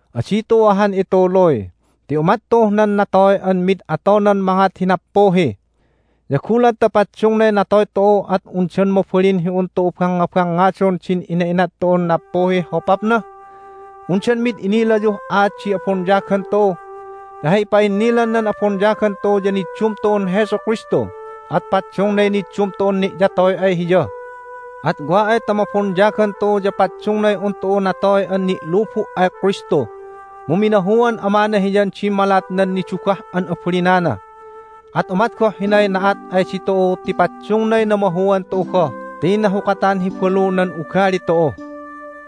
Adi tu'u ahan ituluy! Ti umat tu'uh nan natoy an mid atonan mangat hi nappuhi. Ya gulat ta paddungnay natoy tu'u at undan mabalin hi un tu'u bangngabangngadon din ina'inat tu'un nappuhih hopapna? Undan mi'id inilayuh aat di abonyagan tu'u? Ti hay ipa'innilan nan abonyagan tu'u ya niddum tu'un Jesu Kristu, at paddungnay niddum tu'un ni'yatoy ay Hiya. At wa ay ta mabonyagan tu'u ya paddungnay un tu'u natoy an ni'lubu' ay Kristu. Mu minahuan Amana Hiyan dimmalat nan nidugah an abalinana, at umat goh hinay na'at ay ditu'u ti paddungnay namahuan tu'u goh ti nahukatan hi balu nan ugali tu'u.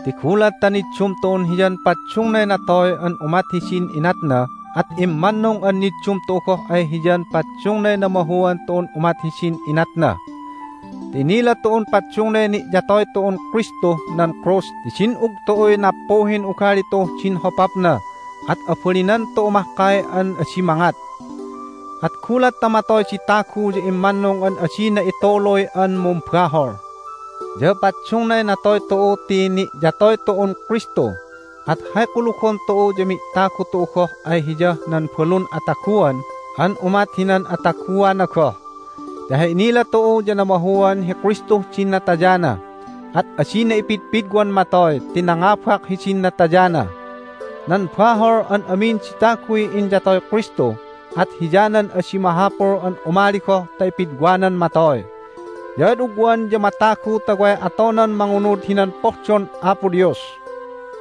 Ti gulat ta niddum tu'un Hiyan paddungnay natoy an umat hidin inatna at immannung an niddum tu'u goh ay Hiyan paddungnay namahuan tu'un umat hidin inatna. Ti inila tu'un paddungnay ni'yatoy tu'un Kristuh nan krus ti din'ug tu'uy nappuhin ugali tu'uh din hopapna, at abalinan tu'u mahkay an adi mangat. At gulat ta matoy di tagu ya immannung an adina ituluy an mumbahol! Ya paddungnay natoy tu'u ti ni'yatoy tu'un Kristu. At hay kulugon tu'u ya mi'tagu tu'u goh ay Hiyah nan balun ataguan an umat hinan ataguana goh. Ti hay inila tu'u ya namahuan hi Kristuh din natayana, at adina ipidpidwan matoy ti nangabak hidin natayana. Nan bahol an amin di taguy inyatoy Kristu, at hiyanan adi mahapul an umali goh ta ipidwanan matoy. Ya ad ugwan ya matagu ta way atonan mangunud hinan pohdon Apo Dios.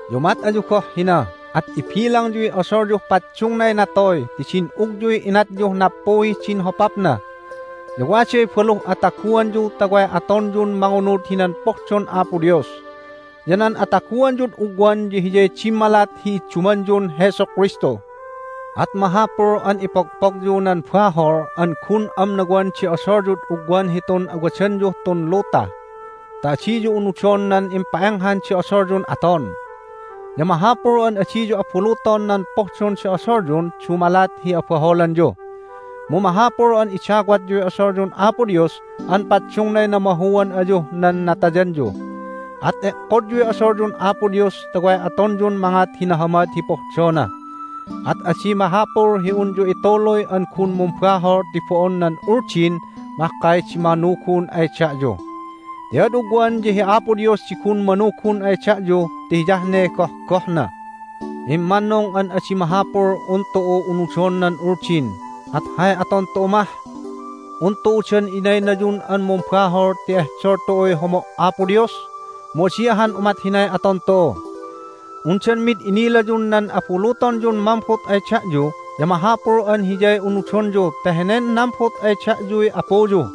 Ya umat ayu goh hina, at ibilangyuy odolyuh paddungnay natoy ti din'ugyuy inatyuh nappuhih din hopapna. Ya waday baluh ataguanyu ta way atonyun mangunud hinan pohdon Apo Dios. Ya nan ataguanyud ugwan ya hiyay dimmalat hi iddumanyun Jesu Kristu. At mahapul an ipogpogyu nan bahol an gun amnawan di odolyud ugwan hitun wadanyuh tun luta ta adiyu unudon nan impa'enghan di odolyun aton. Ya mahapul an adiyu abuluton nan pohdon di odolyun dumalat hi abaholanyu. Mu mahapul an idawatyuy odolyun Apo Dios an paddungnay namahuan ayuh nan natayanyu. At e'kodyuy odolyun Apo Dios ta way atonyun mangat hi nahamad hi pohdona. At adi mahapul hi unyu ituluy an gun mumbahol ti bo'on nan Uldin mahkay di manugun ay da'yu. Ti ad ugwan ya hi Apo Dios di gun manugun ay da'yu ti hiyah ne gohgohna. Immannung an adi mahapul un tu'u unudon nan Uldin, at hay aton tu'u mah? Un tu'u dan inaynayun an mumbahol ti ehdol tu'uy homo' Apo Dios? Mu adi ahan umat hinay aton tu'u! Undan mid inilayun nan abulutonyun mambut ay da'yu ya mahapul an hiyay unudonyu ti henen nambut ay da'yuy apuyu?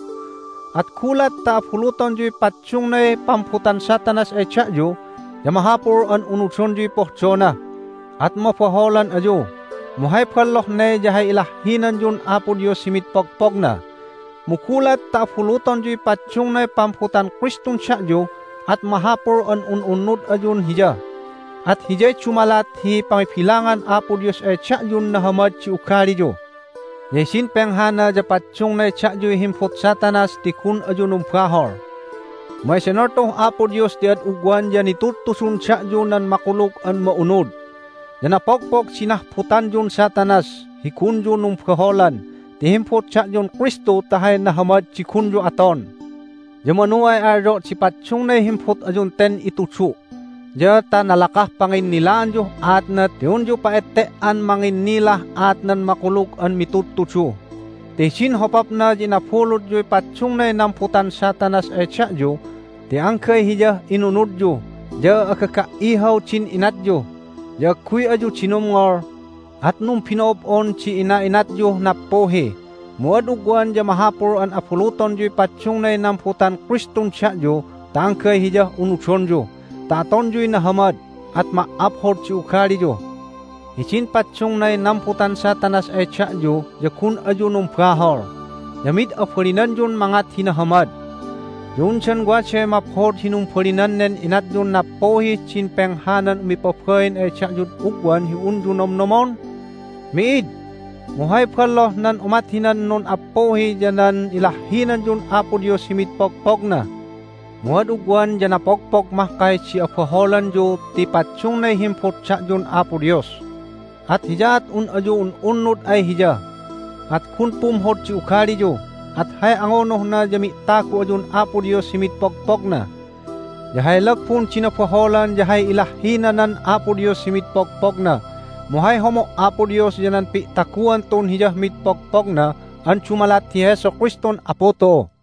At gulat ta abulutonyuy paddungnay pambutan Satanas ay da'yu ya mahapul an unudonyuy pohdona, at mabaholan ayu, mu hay balloh ne ya hay ilahhinanyun Apo Dios hi mid pogpogna. Mu gulat ta abulutonyuy paddungnay pambutan Kristun da'yu at mahapul an un'unnud ayun Hiya, at hiyay dumalat hi pangibilangan Apo Dios ay da'yun nahamad di ugaliyu. Ya hidin penghana ya paddungnay da'yuy himbut Satanas ti gun ayu numbahol. Mu edenol tu'uh Apo Dios ti ad ugwan ya nitudtudun da'yu nan Makulug an Ma'unud. Ya napogpog di nahbutanyun Satanas hi gunyu numbaholan ti himbut da'yun Kristu ta hay nahamad di gunyu aton. Ya manu ay alyo' di paddungnay himbut ayun ten itudu' ya ta nalakah panginnilaanyuh aatna ti unyu pa'ette"an manginnilah aat nan Makulug an Mitudtudu. Ti hidin hopapna ya inabulutyuy paddungnay nambutan Satanas ay da'yu ti anggay hiyah inunudyu, ya agaga"ihaw din inatyu, ya agguy ayu dinumngol, at numbino'ob'on di ina'inatyuh nappuhi. Mu ad ugwan ya mahapul an abulutonyuy paddungnay nambutan Kristun da'yu ta anggay Hiyah unudonyu ta atonyuy nahamad, at ma"aphod di ugaliyu. Hidin paddungnay nambutan Satanas ay da'yu ya gun ayu numbahol, ya mid abalinanyun mangat hi nahamad. Ya undan waday maphod hi numbalinan nen inatyun nappuhih din penghanan umipabain ay da'yud ugwan hi unyu nomnomon? Mi'id. Mu hay balloh nan umat hinan nun'appuhi ya nan ilahhinanyun Apo Dios hi mid pogpogna! Mu ad ugwan ya napogpog mahkay di abaholanyu ti paddungnay himbut da'yun Apo Dios. At hiyaat un ayu un'unnud ay Hiya, at gun pumhod di ugaliyu, at hay angunuhna ya mi'tagu ayun Apo Dios hi mid pogpogna. Ya hay lagbun di nabaholan ya hay ilahhinanan Apo Dios hi mid pogpogna. Mu hay homo' Apo Dios ya nan pi'taguan tu'un Hiyah mid pogpogna an dumalat hi Jesu Kristun Apu tu'u.